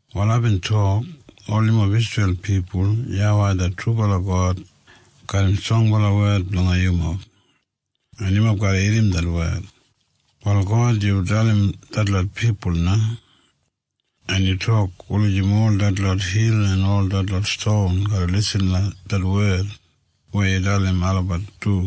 Wal aibin tok, “Ol yumob Isreil pipul, YAWEI det trubala God garram strongbala wed blanga yumob, en yumob garra irrim det wed. “Wal God, yu dalim detlot pipul na, en yu tok wulijim ol detlot hil en ol detlot ston garra lisin langa det wed weya yu dalim olabat du.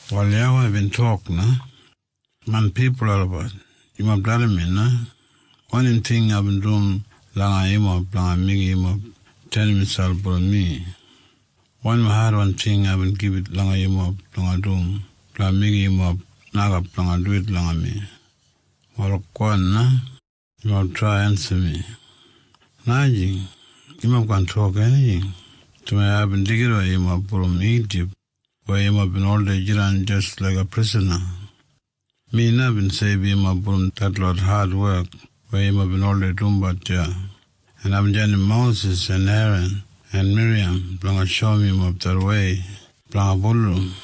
Wal YAWEI bin tok na, “Main pipul olabat, yumob dalim mi na. Wanim ting aibin dum langa yumob blanga meigim yumob tenim miselp brom mi? Wanim adwan ting aibin gibit langa yumob blanga dum blanga meigim yumob nokap blanga duwit langa mi? Wal gowan na. Yumob trai ensim mi. “Najing. Yumob kaan tok enijing, dumaji aibin deigidawei yumob brom Ijip weya yumob bin oldei jidan jis laiga prisana. Mi na bin seibum yumob brom detlot adwek weya yumob bin oldei dumbat deya, en aibin jandim Mosis en Eran en Miriyam blanga shoum yumob det wei blanga bulurrum.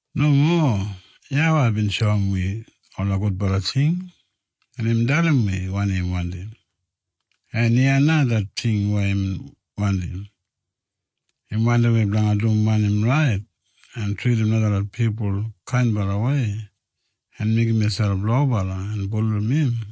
Nomo. YAWEI bin shoum wi ola gudbala ting, en imbin dalim wi wanim im wandim. En iya na det ting weya im wandim. Im wandim wi blanga dum wanim rait, en tridim najalot pipul kainbalawei en meigim miselp lobala en bulurrum im.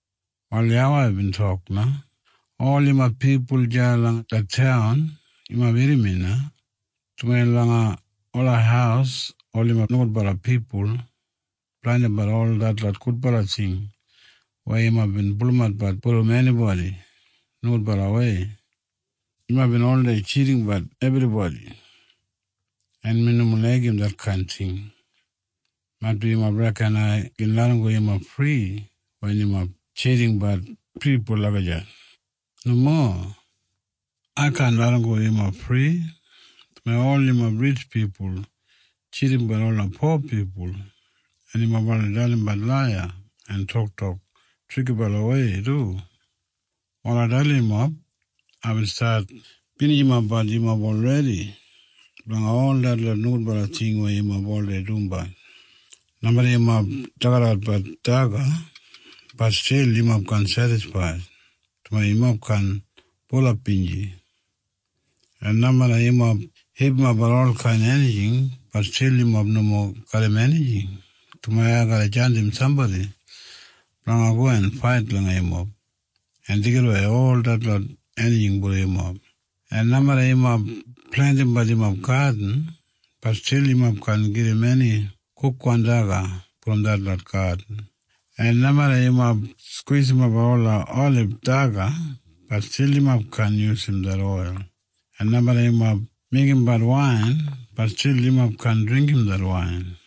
Wal YAWEI bin tok na, “Ol yumob pipul deya langa det taun, yumob irrim mi na, dumaji langa ola haus ol yumob nogudbala pipul blandimbat ol detlot gudbala ting weya yumob bin pulumatbat brom enibodi nogudbalawei. Yumob bin oldei tjidimbat enibodi, en mi nomo laigim detkain ting. Maitbi yumob reken ai gin larramgo yumob fri wen yumob tjidimbat pipul lagijat. Nomo. Ai kaan larramgo yumob fri, dumaji ol yumob ritj pipul tjidimbat ola po pipul, en yumob oldei dalimbat laiya en toktok trikibalawei du. “Wal ai dalim yumob. Aibin stat binijimapbat yumob olredi blanga ol detlot nogudbala ting weya yumob oldei dumbat. Nomeda yumob dagadagat daga, bat stil yumob kaan sedisfaid, dumaji yumob kaan bulap binji. En nomeda yumob hipimapbat olkain enijing, bat stil yumob nomo garram enijing, dumaji ai garra jandim sambodi blanga go en fait langa yumob en deigidawei ol detlot enijing brom yumob. En nomeda yumob plentimbat yumob gadin, bat stil yumob kaan gedim eni kukwan daga brom detlot gadin. En nomeda yumob skwisimap ola olib daga, bat stil yumob kaan yusum det oil. En nomeda yumob meigimbat wain, bat stil yumob kaan dringgim det wain.